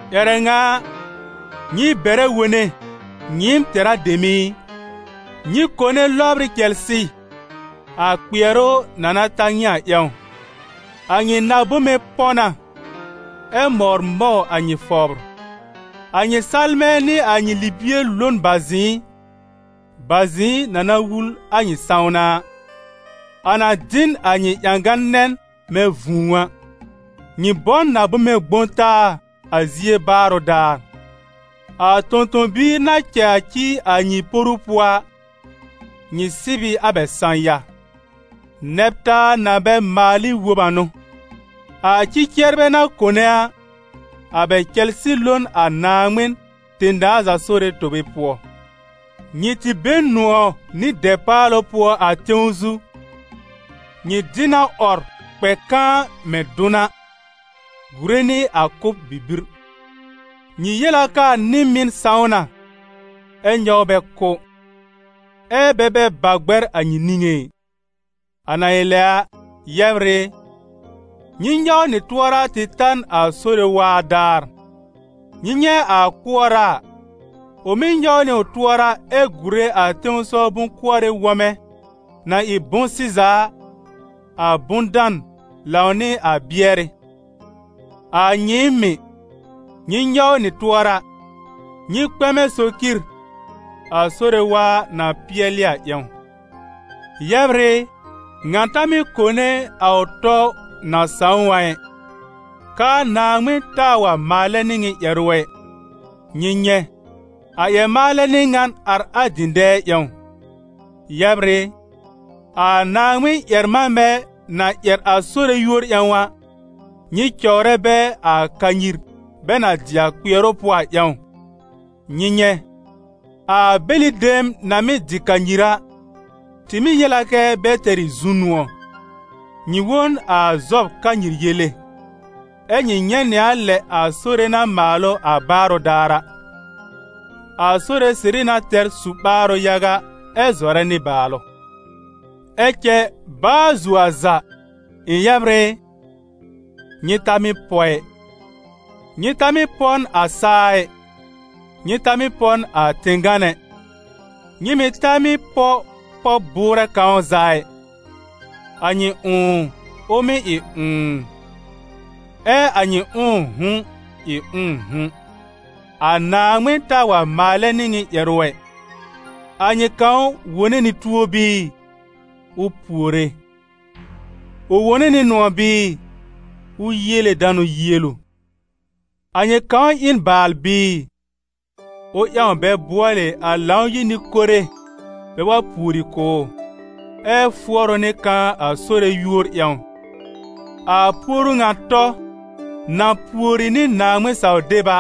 Ƴɛrɛ ŋa a, nyɩ bɛrɛ wone, nyɩɩm tɛ̀rá dem i! Nyɩ kone lɔbr ɩ cɛlsɩ, a kpɩɛrʋ na na ta nyɩ a ƴãw! A nyɩ na-bome pɔ̃ na, ɛ mɔwr mɔw a nyɩ fɔbr. A nyɩ salmɛ̃ nɩ a nyɩ libie lo n bazɩ̃ɩ, bazɩ̃ɩ na na wul a nyɩ sãwna a; a na dɩ n a nyɩ ƴãgã-nɛn mɛ̃ vũu a. Nyɩ bɔ n na-bome gbõ taa a zie baarʋ daar. A tõ-tõ-biir na cɛ a ci a nyɩ poru pʋɔ a, nyɩ sɩb ɩ a bɛ sã-ya. Nɛb-taa na bɛ maal ɩ wob a n'ʋ! A ci-cɩɛrbɛ na kone a, a bɛ cɛlsɩ lo n a Naaŋmɩn, tẽ-daa za Sore, tobe pʋɔ. Nyɩ tɩ be n nʋ̃ɔ̀ nɩ dɛpaalʋ pʋɔ a tẽw zu. Nyɩ dɩ na 'wɔr kpɛ kãa mɛ̃ dʋn a, gùre nɩ a kʋ́b bibir. Nyɩ yel a k'aa nɩ-mɩn sãw na, ɛ nyɔw bɛ kʋ́, ɛ́ bɛ bɛ ba gbɛr a nyɩ niŋé ɩ. A na ɩ lɛ a, yɛbr ɩ, nyɩ nyɔw nyɩ tʋɔra tɩ ta n a Sore waa daar. Nyɩ nyɛ̃ a kʋɔra a, ʋ mɩ́ nyɔw nɩ ʋ tʋɔra ɛ gùre a tẽsɔw bʋ̃-kʋɔrɩ wɔmɛ na ɩ bʋ̃-sɩza a, a bʋ̃-dan lãw nɩ a bɩɛrɩ. A nyɩɩm mɩ̀, nyɩ nyɔw nyɩ tʋɔra, nyɩ kpɛmɛ socir, a Sore waa na pɩɛlɩ a ƴãw. Yɛbr ɩ, ŋa ta mɩ́ kone a ʋ tɔ na sãw ʋ a ɩ, k'aa Naaŋmɩn taa wa maalɛ nɩ nyɩ ƴɛrʋ ɛ. Nyɩ nyɛ̃, a ƴɛr-maalɛ n'ɩ ŋan ar a dɩ̃dɛɛ ƴãw. Yɛbr ɩ, a Naaŋmɩn-ƴɛr-manbɛ na ƴɛr a Sore yúor ƴãw a, nyɩ cɔwrɛ bɛ a kanyir bɛ na dɩ a kpɩɛrʋ pʋɔ a ƴãw. Nyɩ nyɛ̃, a bɛlɩ dem na mɩ́ dɩ kanyir a, tɩ mɩ́ yel a kɛ́ bɛ tɛr ɩ zu-nʋ̃ɔ; nyɩ wõ n a Zɔb kanyir yele, ɛ́ nyɩ nyɛ̃ nɩ a lɛ a Sore na maal ʋ a baarʋ daar a. A Sore sɩrɩ na tɛr su-ɓaarʋ yaga ɛ zɔrɛ nɩbaalʋ. Ɛ cɛ baa zuo a za, ɩ̃ yɛbr ɩ, nyɩ ta mɩ́ pɔ ɩ: nyɩ ta mɩ́ pɔ n a saa ɩ, nyɩ ta mɩ́ pɔ n a tẽ-gán ɛ, nyɩ mɩ̀ ta mɩ́ pɔ pɔb-bʋʋrɛ kãw za ɩ. A nyɩ ʋ̃ʋ ʋ mɩ́ ɩ ʋ̃ʋ, ɛ a nyɩ ʋ̃ʋ'hʋ̃ ɩ ʋ̃ʋ'hʋ̃, a Naaŋmɩn taa wa maalɛ nɩ nyɩ ƴɛrʋ ɛ. A nyɩ kãw wone nɩ tuo bɩɩ? Ʋ puore. Ʋ wone nɩ nʋ̃ɔ̀ bɩɩ? Ʋ yiele danʋ yielu. A nyɩ kãw ɩ n baal bɩɩ? Ʋ ƴãw bɛ bʋɔlɩ a Lãw-yir nɩ-kore bɛ wa pùori kʋ̀ ʋ, ɛ fʋɔr ʋ nɩ kãa a Sore yúor ƴãw. A puoru ŋa tɔ, na pùori nɩ Naaŋmɩn-saw-deb a,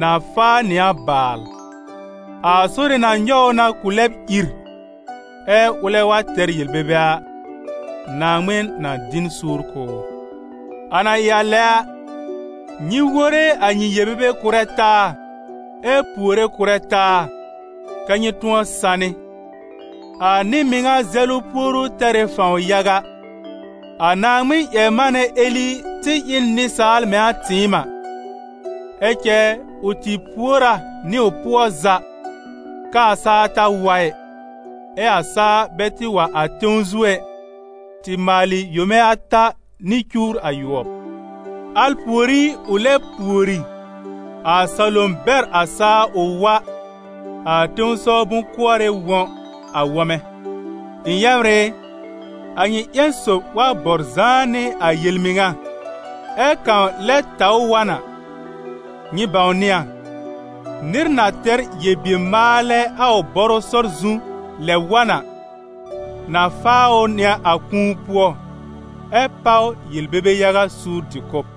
na faa nɩ a baal: a Sore na nyɔw ʋ na ʋ lɛb ìr, ɛ ʋlɛ wa tɛr yel-bebe a, Naaŋmɩn na dɩ n suur kʋ̀ ʋ. A na ɩ lɛ a, nyɩ wore a nyɩ yel-bebe kʋ̀rɛ taa ɛ puore kʋ̀rɛ taa, kɛ́ nyɩ tʋ̃ɔ sanɩ. A nɩ-mɩŋa zɛlʋ puoru tɛr ɩ fãw yaga. A Naaŋmɩn-ƴɛr-manɛ Eli tɩ ɩ n nɩsaal mɛ̃ a tɩɩm a, ɛ cɛ ʋ tɩ pùor a nɩ ʋ pʋɔ za, k'aa saa ta wa ɩ, ɛ a saa bɛ tɩ wa a tẽw zu ɛ, tɩ maalɩ yome ata nɩ cuwr ayʋɔb. Al pùorí ʋ lɛ pùori, a salom bɛr a saa ʋ wa, a tẽsɔw bʋ̃-kʋɔrɩ wɔ̃ a wɔ̃mɛ. Ɩ̃ yɛbr ɩ, a nyɩ ƴẽn sob wa bɔr zãá nɩ a yel-mɩŋa, ɛ́ kãw lɛ taw ʋ wa n a, nyɩ bãwnɩ a, nɩr na tɛr yel-bier-maalɛ a ʋ bɔrʋ sɔr zu lɛb wa n a, na faa ʋ nɩ a kũu pʋɔ ɛ páw yel-bebe yaga suur dɩ-kʋ̀b.